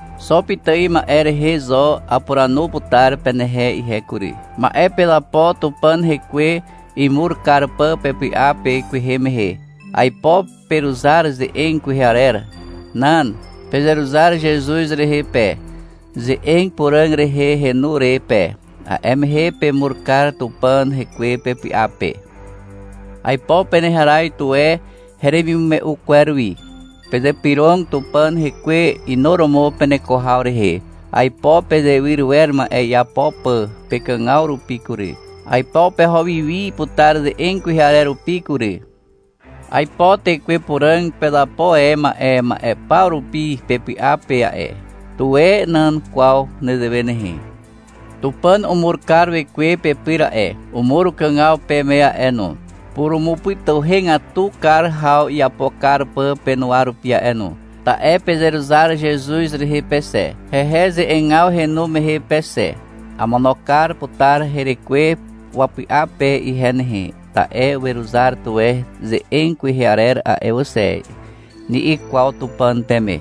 Xo pitài ma'e rehe zo apuranu putar penehe ihe kury. Ma'e pezapo Tupàn Hekwe imur kar pà pepy'a pe kwehe mehe. Aipo peruzar ze'eg kwehe arer. Nan. Pezeruzar Zezuz rehe pe, ze'eg puràg rehe henu re pe. A'e mehe pemur kar Tupàn Hekwe pepy'a pe. Aipo peneharaz tuwe heremimume'u kwer wi. Pezypyrog Tupàn Hekwe inuromo peneko haw rehe. Aipo pezewyr wer ma'e iapo pà pekàgaw rupi kury. Aipo peho wi wi putar ze'eg kwehe arer rupi kury. Aipo Tekwe Puràg uzapo e a'e ma'e paw rupi pepy'a pe a'e. Tuwe nan kwaw nezewe nehe. Tupàn umur kar Wekwe pepyr a'e. Umur ukàgaw peme a'e no, purumupytuhegatu kar haw iapo kar pà penuwa rupi a'e no. Ta'e pezeruzar Zezuz rehe pe xe, hehe ze'egaw henu mehe pe xe. — Amono kar putar herekwe wapy'a pe ihe nehe, ta'e weruzar tuwe ze'eg kwehe arer a'e wà xe, ni'i kwaw Tupàn peme.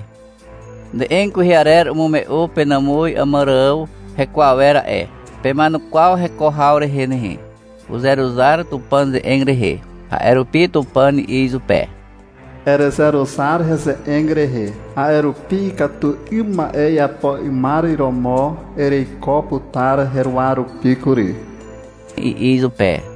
Ze'eg kwehe arer umume'u penàmuz Àmàrààw heko awer a'e. Pema'enukwaw heko haw rehe nehe. Uzeruzar Tupàn ze'eg rehe. A'e rupi Tupàn i'i izupe. — Erezeruzar heze'eg rehe, a'e rupi ikatu 'ym ma'e iapo 'ymar romo ereiko putar heruwa rupi kury, i'i izupe.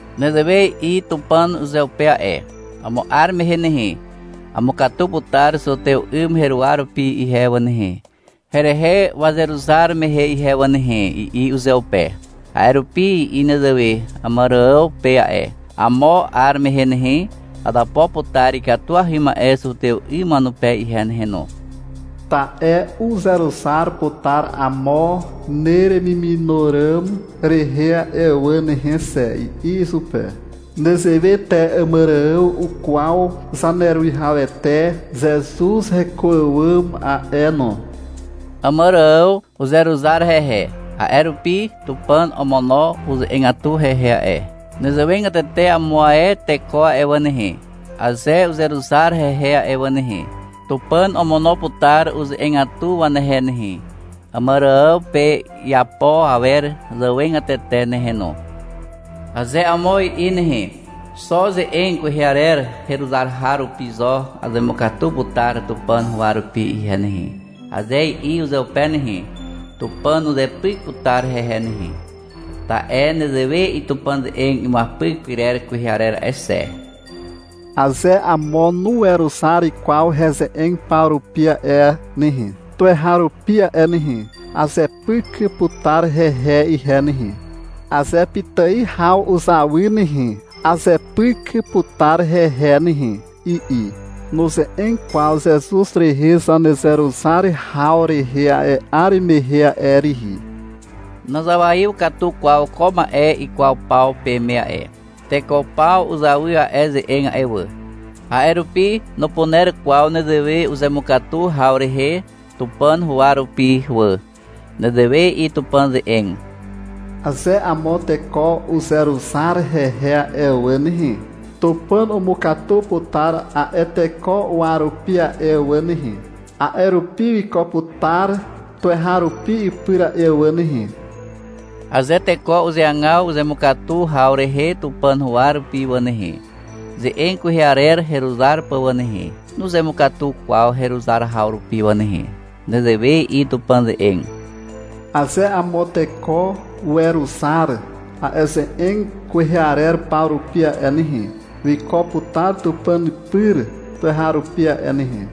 Nezewe i'i Tupàn uzeupe a'e. — Amo 'ar mehe nehe, amukatu putar zutew 'ym heruwa rupi ihe wà nehe, herehe wazeruzar mehe ihe wà nehe, i'i uzeupe. A'e rupi i'i nezewe Àmàrààw pe a'e. — Amo 'ar mehe nehe, azapo putar ikatuahy ma'e zutew 'ym wanupe ihe nehe no. Ta'e uzeruzar putar amo neremimino ràm rehe a'e wà nehe xe, i'i izupe. Nezewe te Àmàrààw ukwaw Zaneruwihawete Zezuz heko àwàm a'e no. Àmàrààw uzeruzar hehe. A'e rupi Tupàn omono uze'egatu hehe a'e. Nezewegatete amo ae teko a'e wà nehe, aze uzeruzar hehe a'e wà nehe, Tupàn omono putar uze'egatu wanehe Àmàrààw pe iapo awer zàwegatete nehe no. Aze amo i'i nehe. — Xo ze'eg kwehe arer heruzar haw rupi zo azemukatu putar Tupàn huwa rupi ihe nehe, aze i'i uzeupe nehe, Tupàn uzepyk putar hehe nehe. Ta'e nezewe i'i Tupàn ze'eg imuapyk pyrer kwehe arer a'e xe. — Aze amo nuweruzar kwaw heze'eg paw rupi a'e nehe, tuweharupi a'e nehe, azepyk putar hehe ihe nehe. Aze pitài haw uzawy nehe, azepyk putar hehe nehe, i'i. (Nuze'eg kwaw Zezuz rehe zanezeruzar haw rehe a'e 'ar mehe a'e rihi.) Nazawaiw katu kwaw ko ma'e ikwaw paw peme a'e. Teko paw uzawy a'e ze'eg a'e wà. A'e rupi nupuner kwaw nezewe uzemukatu haw rehe Tupàn huwa rupi wà. Nezewe i'i Tupàn ze'eg. — Aze amo teko uzeruzar hehe a'e wà nehe, Tupàn umukatu putar a'e teko uwa rupi a'e wà nehe. A'e rupi wiko putar tuweharupi ipyr a'e wà nehe. Aze teko uzeagaw uzemukatu haw rehe Tupàn huwa rupi wà nehe, ze'eg kwehe arer heruzar pà wà nehe, nuzemukatu kwaw heruzar haw rupi wà nehe. Nezewe i'i Tupàn ze'eg. — Aze amo teko weruzar a'e ze'eg kwehe arer paw rupi a'e nehe, wiko putar Tupàn pyr tuweharupi a'e nehe.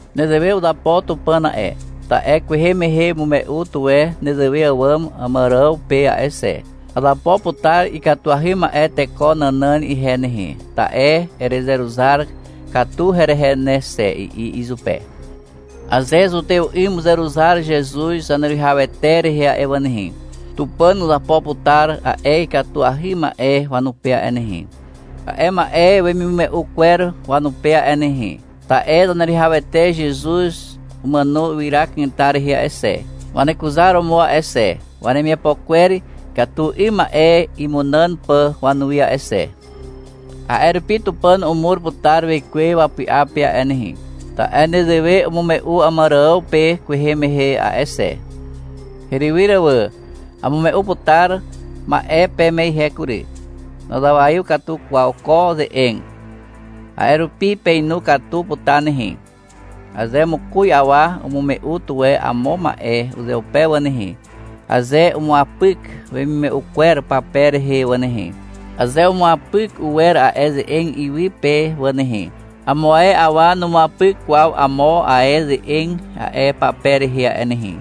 Nezewe uzapo Tupàn a'e, ta'e kwehe mehe umume'u tuwe nezewe àwàm Àmàrààw pe a'e xe. — Azapo putar ikatuahy ma'e teko nànàn ihe nehe, ta'e erezeruzar katu herehe ne xe, i'i izupe. Aze zutew 'ym uzeruzar Zezuz Zaneruwihawete rehe a'e wà nehe, Tupàn uzapo putar a'e ikatuahy ma'e wanupe a'e nehe, a'e ma'e wemimume'u kwer wanupe a'e nehe, ta'e Zaneruwihawete Zezuz umàno ywyra kanetar rehe a'e xe, wanekuzaromo a'e xe, wanemiapo kwer ikatu 'ym ma'e imunàn pà wanuwi a'e xe. A'e rupi Tupàn umur putar Wekwe wapy'a pe a'e nehe, ta'e nezewe umume'u Àmàrààw pe kwehe mehe a'e xe. Herywyr wà, amume'u putar ma'e peme ihe kury. Nazawaiw katu kwaw ko ze'eg. A'e rupi peinu katu putar nehe. Aze mokoz awa umume'u tuwe amo ma'e uzeupe wà nehe, aze umuapyk wemimume'u kwer pape rehe wà nehe, aze umuapyk uwer a'e ze'eg iwy pe wà nehe, amo ae awa numuapyk kwaw amo ae ze'eg a'e pape rehe a'e nehe.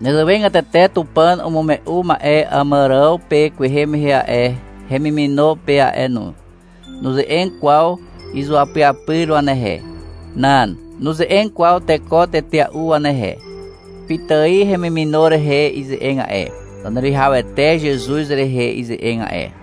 Nezewegatete Tupàn umume'u ma'e Àmàrààw pe kwehe mehe a'e, hemimino pe a'e no. Nuze'eg kwaw izuapyapyr wanehe. Nan. Nuze'eg kwaw teko tetea'u wanehe. Pitài hemimino rehe ize'eg a'e, (Zaneruwihawete Zezuz rehe ize'eg a'e).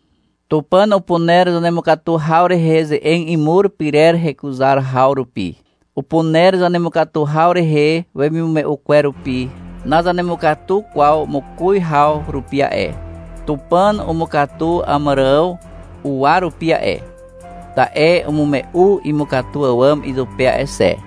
Tupàn upuner zanemukatu haw rehe ze'eg imur pyrer heruzar haw rupi. Upuner zanemukatu haw rehe wemimume'u kwer rupi. Nazanemukatu kwaw mokoz haw rupi a'e. Tupàn umukatu Àmàrààw uwa rupi a'e, ta'e umume'u imukatu àwàm izupe a'e xe.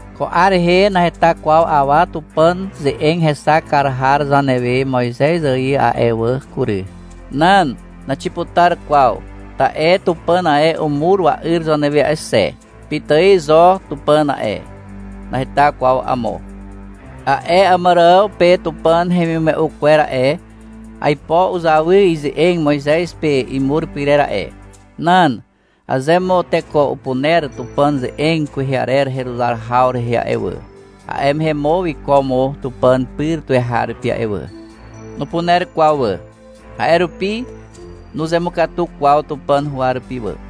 Ko 'ar rehe naheta kwaw awa Tupàn ze'eg hexak kar har zanewe Moizez ài a'e wà kury. Nan. Naxiputar kwaw, ta'e Tupàn ae umur wa'yr zanewe a'e xe. Pitài zo Tupàn a'e. Naheta kwaw amo. A'e Àmàrààw pe Tupàn hemimume'u kwer a'e, aipo uzawy ize'eg Moizez pe imur pyrer a'e. Nan. Aze mo teko upuner Tupàn ze'eg kwehe arer heruzar haw rehe a'e wà, a'e mehe mo wiko mo Tupàn pyr tuweharupi a'e wà. Nupuner kwaw wà. A'e rupi nuzemukatu kwaw Tupàn huwa rupi wà.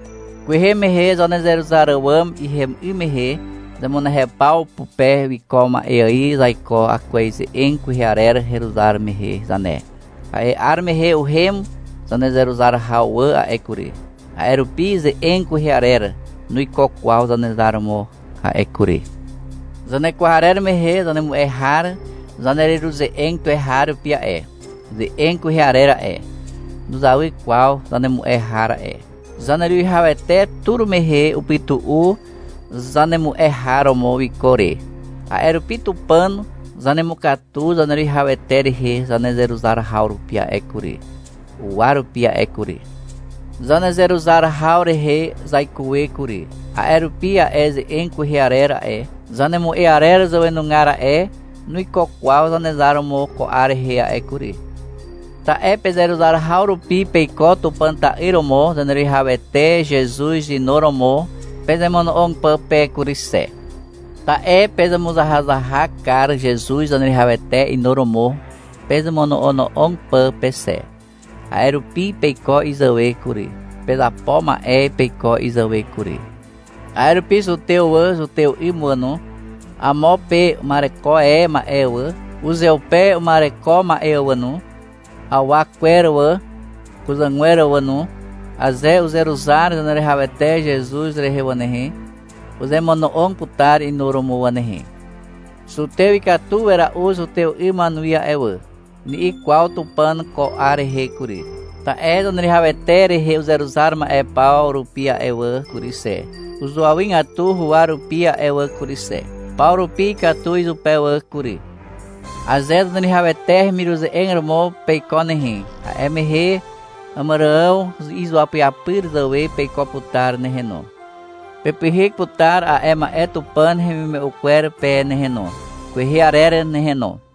Kwehe mehe zanezeruzar àwàm ihem 'ym mehe zemunehew paw pupe wiko ma'e ài zaiko akwez ze'eg kwehe arer heruzar mehe zane. A'e 'ar mehe uhem zanezeruzar haw wà a'e kury. A'e rupi ze'eg kwehe arer nuiko kwaw Zanezar romo a'e kury. Zanekwarer mehe zanemu'e har zanereruze'eg tuweharupi a'e. Ze'eg kwehe arer a'e, nuzawy kwaw zanemu'e har a'e. Zaneruwihawete tur mehe upytu'u zanemu'e har romo wiko re. A'e rupi Tupàn zanemukatu Zaneruwihawete rehe zanezeruzar haw rupi a'e kury, uwa rupi a'e kury. Zanezeruzar haw rehe zaikuwe kury. A'e rupi a'e ze'eg kwehe arer a'e, zanemu'e arer zàwenugar a'e, nuiko kwaw Zanezar romo ko 'ar rehe a'e kury. Ta'e pezeruzar haw rupi peiko Tupàn ta'yr romo Zaneruwihawete Zezuz inuromo pezemono'og pà pe kury xe. Ta'e pezemuzahazahak kar Zezuz Zaneruwihawete inuromo pezemono'ono'og pà pe xe. A'e rupi peiko izàwe kury. Pezapo ma'e peiko izàwe kury. A'e rupi zutew wà, zutew 'ym wà no, amo pe uma'ereko e ma'e wà, uzeupe uma'ereko ma'e wà no, awa kwer wà, kuzàgwer wà no, aze uzeruzar Zaneruwihawete Zezuz rehe wà nehe, uzemono'og putar inuromo wà nehe. — Zutew ikatu wera'u zutew 'ym wanuwi a'e wà, ni'i kwaw Tupàn ko 'ar rehe kury, ta'e Zaneruwihawete rehe uzeruzar ma'e paw rupi a'e wà kury xe, uzuawygatu huwa rupi a'e wà kury xe. Paw rupi ikatu izupe wà kury. Aze Zaneruwihawete hemiruze'eg romo peiko nehe, a'e mehe Àmàrààw izuapyapyr wazàwe peiko putar nehe no. Pepyhyk putar a'e ma'e Tupàn hemimume'u kwer pe nehe no, kwehe arer nehe no.